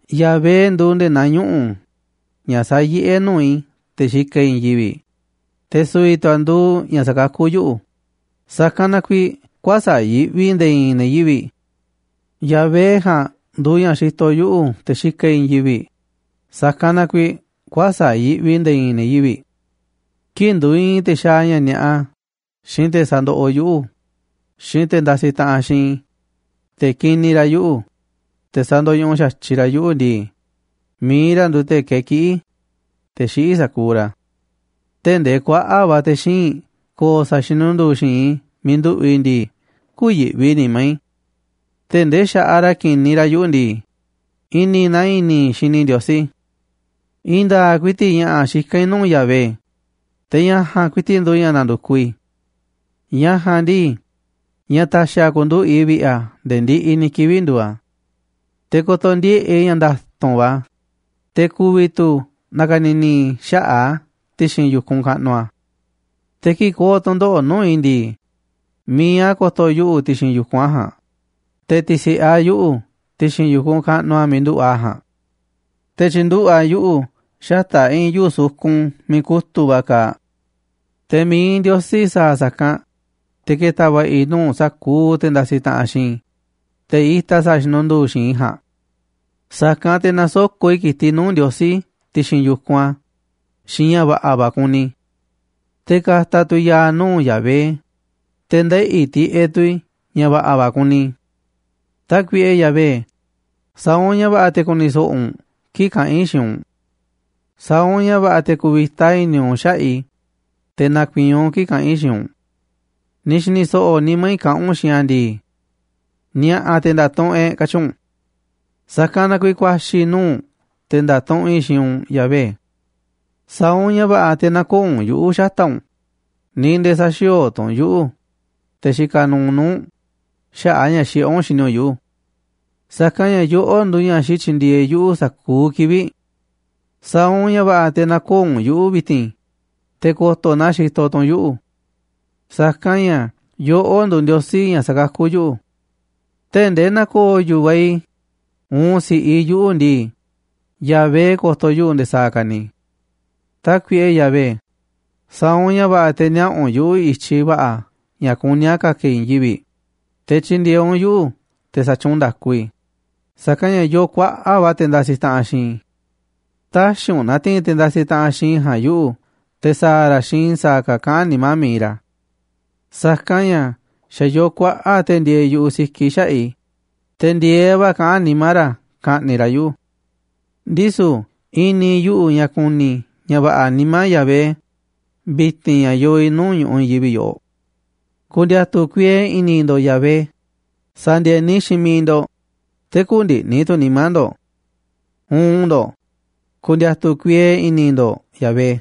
Yahvé nduuꞌ nde̱e̱ naa ñuꞌu̱, ña̱ sayiꞌé nuu̱ꞌ i̱ te̱ xikaꞌ i̱ i̱i̱n yivi̱ꞌ, te̱ su̱vi̱ tu̱ a̱ nduuꞌ ña̱ sakakú yuꞌu̱, sa̱kanꞌ na kuiiꞌ kuäsa̱ꞌ yiꞌvi i̱ nde̱e̱ i̱i̱n ne̱ yivi̱ꞌ. Yahvé ja̱a̱nꞌ nduuꞌ ña̱ xitoꞌ yuꞌu̱ te̱ xikaꞌ i̱ i̱i̱n yivi̱ꞌ, sa̱kanꞌ na kuiiꞌ kuäsa̱ꞌ yiꞌvi i̱ nde̱e̱ i̱i̱n ne̱ yivi̱ꞌ. Kii̱ꞌ nduiinꞌ te̱ xaaꞌ ña̱ ni̱a̱ꞌa, xiinꞌ te̱ sandoꞌoꞌ yuꞌu̱, xiinꞌ te̱ ndasiꞌ taꞌanꞌ xiinꞌ i̱, te̱ kiniꞌ ra̱ yuꞌu̱, te̱ sa̱ndo̱ñuꞌuꞌ xa̱tyiꞌ ra̱ yuꞌu̱ ndii, mi̱iꞌ ra̱ nduuꞌ te̱ kakiꞌí, te̱ xiꞌí sa̱kuuꞌ ra̱. Tee̱ꞌ ndee kuaꞌa̱ꞌ va̱ te̱ xíinꞌ ko̱o̱ sa̱a̱ xinundu̱u̱ xi̱i̱nꞌ i̱ miiꞌ nduꞌu̱ꞌ i̱ ndii, kü̱yi̱ꞌvi nimá i̱. Tee̱ꞌ ndee xa̱ꞌaꞌ ra̱ kiniꞌ ra̱ yuꞌu̱ ndii, i̱ni̱ naa i̱ni̱ i̱ xini i̱ Ndiosí. I̱i̱n nda̱a̱ꞌ ku̱i̱ti̱ꞌ ña̱ꞌa̱ xikán i̱ nuu̱ꞌ Yahvé, te̱ ña̱ ja̱a̱nꞌ ku̱i̱ti̱ꞌ nduuꞌ ña̱ na̱ndu̱kuꞌ i̱. Ña̱ ja̱a̱nꞌ ndii, ña̱ ta̱xi̱ a̱ ku̱nduꞌu̱ꞌ i̱ vi̱ꞌe̱ a̱ nde̱e̱ ndiꞌiꞌ ni̱ kivi̱ꞌ nduuꞌ a̱. Te̱ ko̱to̱ ndieꞌe̱ꞌ i̱ ña̱ nda̱tu̱nꞌ va̱ a̱, te̱ ku̱vi̱ tu̱ na̱ka̱ni̱ni̱ i̱ xaꞌa̱ꞌ a̱ ti̱xi̱n yu̱kunꞌ kaꞌnuꞌ a̱. Te̱ kii̱ꞌ ko̱o̱ tu̱ndoꞌo̱ꞌ nuu̱ꞌ i̱ ndii, mi̱iꞌ a̱ ko̱to̱ yuꞌu̱ ti̱xi̱n yu̱kunꞌ a̱ ja̱a̱nꞌ, te̱ ti̱si̱ꞌe a̱ yuꞌu̱ ti̱xi̱n yu̱kunꞌ kaꞌnuꞌ a̱ miiꞌ nduꞌu̱ꞌ a̱ ja̱a̱nꞌ. Te̱ tyi̱nduꞌu̱ꞌ a̱ yuꞌu̱ xata̱ꞌ i̱i̱n yuu̱ꞌ sukun miiꞌ kutu̱ꞌ va̱ kaaꞌ. Te̱ mi̱iꞌ Ndiosí sa̱a̱ sa̱kanꞌ, te̱ ke̱ta̱ va̱ꞌa̱ i̱ nuu̱ꞌ sa̱kuuꞌ te̱ ndasiꞌ taꞌanꞌ xiinꞌ i̱, te̱ itaꞌ sa̱a̱ xinundu̱u̱ xi̱i̱nꞌ i̱ ja̱a̱nꞌ. Sa̱kanꞌ te̱ na̱soko̱ꞌ i̱ ki̱tiꞌ nuu̱ꞌ Ndiosí ti̱xi̱n yu̱kunꞌ a̱ xiinꞌ ña̱ va̱ꞌa̱ va̱ kuni i̱. Te̱ ka̱ta̱ tu̱ i̱ ya̱a̱ nuu̱ꞌ Yahvé, te̱ ndeꞌi̱ tiꞌeꞌ tu̱ i̱ ña̱ va̱ꞌa̱ va̱ kuni i̱. Tákuiꞌe Yahvé, sa̱a̱ u̱nꞌ ña̱ va̱ꞌa̱ te̱ ku̱ni̱ so̱ꞌo̱ u̱nꞌ kii̱ꞌ kaꞌán i̱ xiinꞌ u̱nꞌ. Sa̱a̱ u̱nꞌ ña̱ va̱ꞌa̱ te̱ ku̱vi̱ta i̱ni̱ u̱nꞌ xaꞌa̱ꞌ i̱, te̱ na̱ku̱i̱i̱n u̱nꞌ kii̱ꞌ kaꞌán i̱ xiinꞌ u̱nꞌ. Ni̱ xi̱ni̱ so̱ꞌo̱ nimá i̱ kaꞌán u̱nꞌ xiinꞌ a̱ ndii: “Ni̱a̱ꞌa̱ te̱ nda̱tuꞌunꞌ e̱ꞌ,” katyi u̱nꞌ. Sa̱kanꞌ na kuiiꞌ ku̱a̱xi̱ i̱ nuu̱ꞌ u̱nꞌ te̱ nda̱tuꞌunꞌ i̱ xiinꞌ u̱nꞌ, Yahvé. Sa̱a̱ u̱nꞌ ña̱ va̱ꞌa̱ te̱ nä̱ko̱o̱ u̱nꞌ yuꞌu̱ xata̱ꞌ u̱nꞌ, ni̱ nde̱e̱ sä̱xi̱o̱o̱ tu̱ u̱nꞌ yuꞌu̱, te̱ xikaꞌ nuuꞌ nuu̱ꞌ u̱nꞌ, xaꞌa̱ꞌ ña̱ xiꞌé u̱nꞌ xini u̱nꞌ yuꞌu̱. Sa̱kanꞌ ña̱ yoꞌó nduuꞌ ña̱ xityindieeꞌ yuꞌu̱ sa̱kuuꞌ kivi̱ꞌ. Sa̱a̱ u̱nꞌ ña̱ va̱ꞌa̱ te̱ nä̱ko̱o̱ u̱nꞌ yuꞌu̱ vi̱ti̱n, te̱ ko̱to̱ na xitoꞌ tu̱ u̱nꞌ yuꞌu̱. Sa̱kanꞌ ña̱ yoꞌó nduuꞌ Ndiosí ña̱ sakakú yuꞌu̱. Tee̱ꞌ ndee na̱ko̱o̱ yu̱vaꞌ i̱ uun si̱ꞌiꞌ i̱ yuꞌu̱ ndii, Yahvé ko̱to̱ yuꞌu̱ nde̱e̱ sa̱a̱ ka̱ ni̱. Tákuiꞌe Yahvé, sa̱a̱ u̱nꞌ ña̱ va̱ꞌa̱ te̱ niaꞌa̱ u̱nꞌ yuꞌu̱ i̱tyiꞌ va̱ꞌa̱ ña̱ kuní a̱ ka̱ka̱ i̱ i̱i̱n yivi̱ꞌ, te̱ tyi̱ndi̱e̱eꞌ u̱nꞌ yuꞌu̱ te̱ sa̱tyuunꞌ nda̱ku i̱, sa̱kanꞌ ña̱ yoo kuaꞌa̱ꞌ va̱ te̱ ndasiꞌ taꞌanꞌ xiinꞌ i̱. Tä̱xi̱ u̱nꞌ na̱ti̱i̱n te̱ ndasiꞌ taꞌanꞌ xiinꞌ i̱ ja̱a̱nꞌ yuꞌu̱, te̱ sa̱a̱ ra̱ xiinꞌ i̱ sa̱a̱ ka̱ kaꞌán nimá mi̱iꞌ ra̱. Sa̱kanꞌ ña̱ xa̱ yoo kuaꞌa̱ꞌ te̱ ndieeꞌ yu̱ꞌuꞌ sikiꞌ xaꞌa̱ꞌ i̱, te̱ ndi̱e̱eꞌ va̱ kaꞌán nimá ra̱ ka̱ꞌni̱ꞌ ra̱ yuꞌu̱. Ndisu̱ i̱ni̱ yuꞌu̱ ña̱ ku̱ni̱ i̱ ña̱ va̱ꞌa̱ nimá Yahvé vi̱ti̱n ña̱ yoo i̱ nuu̱ꞌ ñu̱ꞌuꞌ i̱i̱n yivi̱ꞌ yoꞌoꞌ. Ku̱ndi̱a̱tu̱ kuiee i̱ni̱ ndo̱ꞌ Yahvé, sa̱ndi̱e̱ni xiinꞌ miiꞌ ndo̱ꞌ, te̱ kü̱ndi̱ꞌni̱ tu̱ nimá ndo̱ꞌ. Uun ndo̱ꞌ, ku̱ndi̱a̱tu̱ kuiee i̱ni̱ ndo̱ꞌ Yahvé.